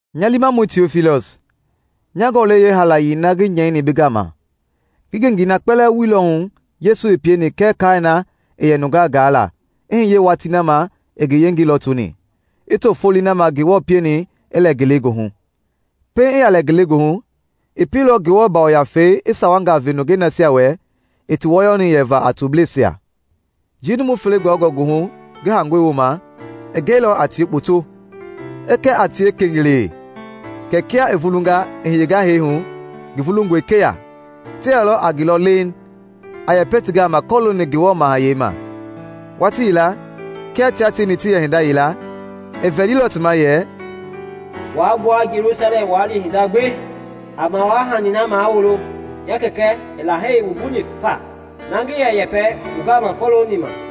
Nya liimamɔi Tiofilɔs. Nya gɔlɛi yeehaalayei na ngi nyɛini bi gama, ngi ngengei na kpɛlɛɛ wuilɔ hu Yesu i pieni kɛɛ kaai na i yɛ nungaa gaa la i hiye watii na ma i ngi yengei lɔtoni, i to foloi na ma Ngewɔ pieni i lɛ ngelegoohu. Pɛiŋ i yaa lɛ ngelegoohu i pieilɔ Ngewɔ Yafei i sawangaa ve nungei nasia wɛ i ti wɔyɔni yɛva a Tobleisia. Njii numu fele gbɔyɔngɔ goohu ngi haangɔi wooma, i gɛilɔ a tie kpoto, a kɛ a tie kengelee kɛ kia i vulunga i hiyenga hee hu, ngi vulungɔe keya. Ti yɛlɔ a ngi lɔ leeŋ, a yɛpɛ ti gama kɔlooni Ngewɔ Mahayɛi ma. Watii yila kia tia tieni ti yɛ hinda yila, i vɛlilɔ ti ma yɛ, “Waa gbua Jelusalɛm waa li hinda gbi, a mawaa-hani na mawulo nya Kɛkɛ i Lahei wumbuni faa, na ngi yɛ yɛpɛi wu gama kɔlooni ma.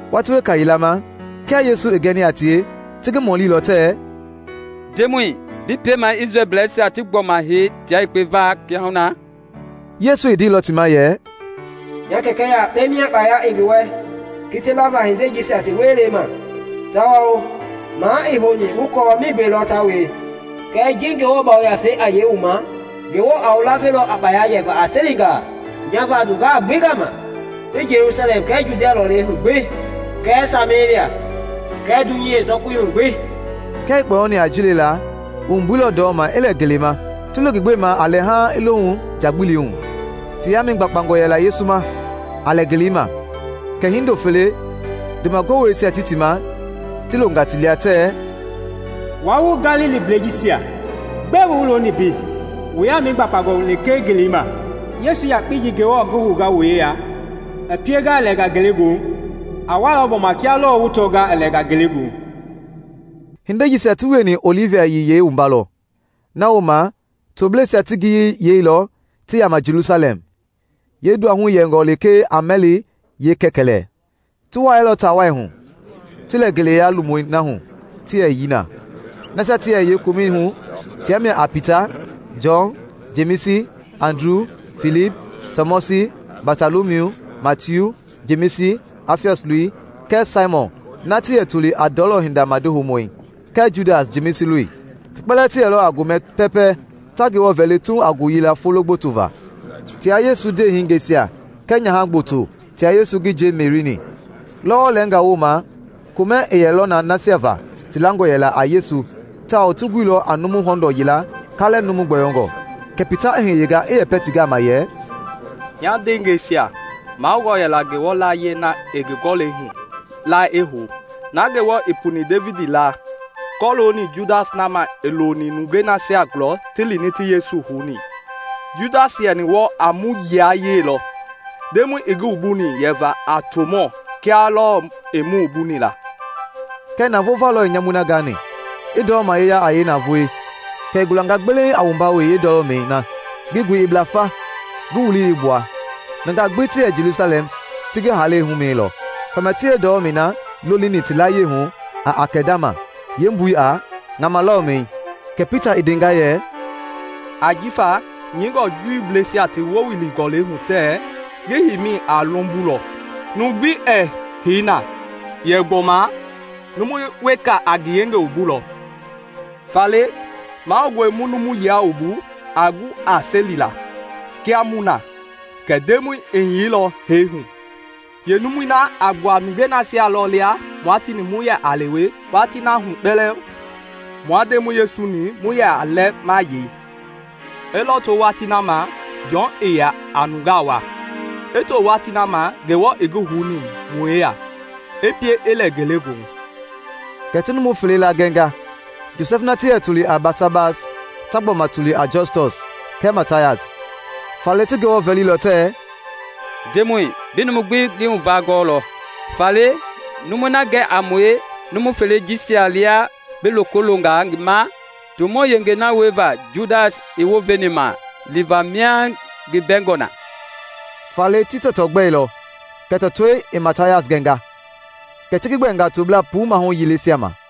Watii weka yila ma kia Yesu i gɛni a tie, ti ngi mɔlilɔ tɛɛ, “Ndemɔi, bi piemaa Isrɛlbleisia ti gbɔma hei tia yekpe va kiahuna?” Yesu i ndeilɔ ti ma yɛ, “Nya Kɛkɛ yakpe mia kpaya i ngi wɛ kiti lava hindei jisia ti wielei ma tawao maa ii houni wu kɔɔ migbe lɔ ta wie. Kɛɛ ji Ngewɔ Yafei a yei wu ma, Ngewɔ a wu lavelɔ a kpaya yɛva a Selingaa nya va nungaa gbi gama ti Jelusalɛm kɛɛ Judia lɔlei hu gbi kɛɛ Samelia kɛɛ dunyei yeesɔkui hu gbi.” Kia i kpɔyɔni a ji lela, i wumbuilɔ ndɔma i lɛ ngelei ma, ti lo ngi gbema a lɛ haaŋ i lohu njagbili hu. Ti yaamɛi gbakpangɔ yɛla Yesu ma a lɛ ngelei ma kɛ hindo fele, ndoma goweisia ti ti ma, ti longa ti lia tɛɛ, “Wua wu Galiliblɛi jisia, gbɛe wu looni mbei wu yaamɛi gbakpangɔ lekee ngelei ma? Yesu yakpei ji Ngewɔ i ngi hounga wu yeya i pienga i lɛnga ngelegoohu, a walɔ gbɔma kia lɔɔ wu tɔnga i lɛnga ngelegoohu.” Hindei jisia ti wieni Ɔlivi Yiyei wumba lɔ. Na wooma tobleisia ti ngiyei yeilɔ ti yaama Jelusalɛm, yeenduahui yɛngɔ lekee a mɛli yeekɛkɛlɛ. Ti wuailɔ taa wai hu, ti lɛ ngeleya lomui na hu ti yɛ yii na. Nasia ti yɛ yee komɛi hu tia mia a Pita, Jɔn, Jemisi, Andru, Filip, Tɔmɔsi, Batɔlɔmiu, Matiu, Jemisi (Afiɔs loi) kɛɛ Saimɔn (na ti yɛ toli a ndɔlɔ hinda madi houmɔi) kɛɛ Judas (Jemisi loi). Ti kpɛlɛɛ ti yɛlɔ a gomɛ pɛɛpɛ ta Ngewɔ vɛli tuuŋ a ngoyila folo gboto va tia Yesu ndeehingeisia kɛɛ nyaha gboto tia Yesu ngi nje Meri-ni. Lɔwɔ lɛɛngaa wooma komɛ i yɛlɔ na nasia va ti langɔ yɛla a Yesu tawao ti guilɔ a numu hɔndɔɔ yila kaalɛ numu gbɔyɔngɔ. Kɛ Pita i hiyenga i yɛpɛ ti gama yɛ, “Nya ndeengɛisia, mahoungɔ yɛla Ngewɔ laayie na i ngi Gɔlɛi hu la i hou, na Ngewɔ i puni Devidi laa kɔlooni Judas na ma i loni nungei nasia gulɔ ti lini ti Yesu houni. Judas i yɛni wɔɔ a mu yilayee lɔ, Ndemɔi i ngi wumbu yɛva a tomɔɔ kia lɔɔ i mu wumbuni la.” (Kɛɛ navoo va lɔ i nyamui na gani, i ndɔlɔma yeya a yeenavoei, kɛ i gulanga gbeleiŋ a wumba wee yeendɔlɔmɛi na, ngi goi i bla fa, ngi wulii gbi i gbua. Nungaa gbi ti yɛ Jelusalɛm ti ngi haalei ji humɛnilɔ, famia ti yeendɔlɔmɛi na lolini ti layie hu a Akɛldama, yeembui a “Ŋama Lɔlɔmɛi.”) Kɛ Pita i ndenga yɛ, “Ajifa nyɛingɔe Juuisia ti Wule Gɔlɛi hu tɛɛ, ‘Ngi heimi a lombolɔ, numu gbi ɛɛ hei na.’ yɛ gbɔma ‘Numu weka a ngi yengei wumbulɔ.’ “Faale mahoungɔe mu numu yila wumbu, a gu a selilaa, kia mu na, kɛ Ndemɔi i hiyeilɔ hee hu. Yeenumui na a gbua nungei nasia lɔ lia mua tieni mu yɛ lewe watii na hu kpɛlɛɛ mua Ndemɔi Yesu-ni mu yɛ lɛ ma yei, i lɔto watii na ma Jɔn i yɛ nungaa wua i to watii na ma Ngewɔ i ngi houni mu yeya i pie i lɛ ngelegoohu.” Kɛ ti numu fele laa gɛnga, Josɛf na ti yɛ toli a Basabas (ta gbɔma toli a Jɔstɔs) kɛɛ Matayas. Faale ti Ngewɔ vɛlilɔ tɛɛ, “Ndemɔi, bi numu gbi lii huvaa gɔɔlɔ, faale numui na gɛ a mue numu felei jisia lia bi loko longa ngi ma tomɔɔ yengei na wieva Judas i wounveni ma liva mia ngi bɛngɔ na.” Faale ti tɔtɔ gbɛilɔ kɛ tɔtɔi i Matayas gɛnga, kɛ ti ngi gbɛɛnga toblaa puu maahu yileisia ma.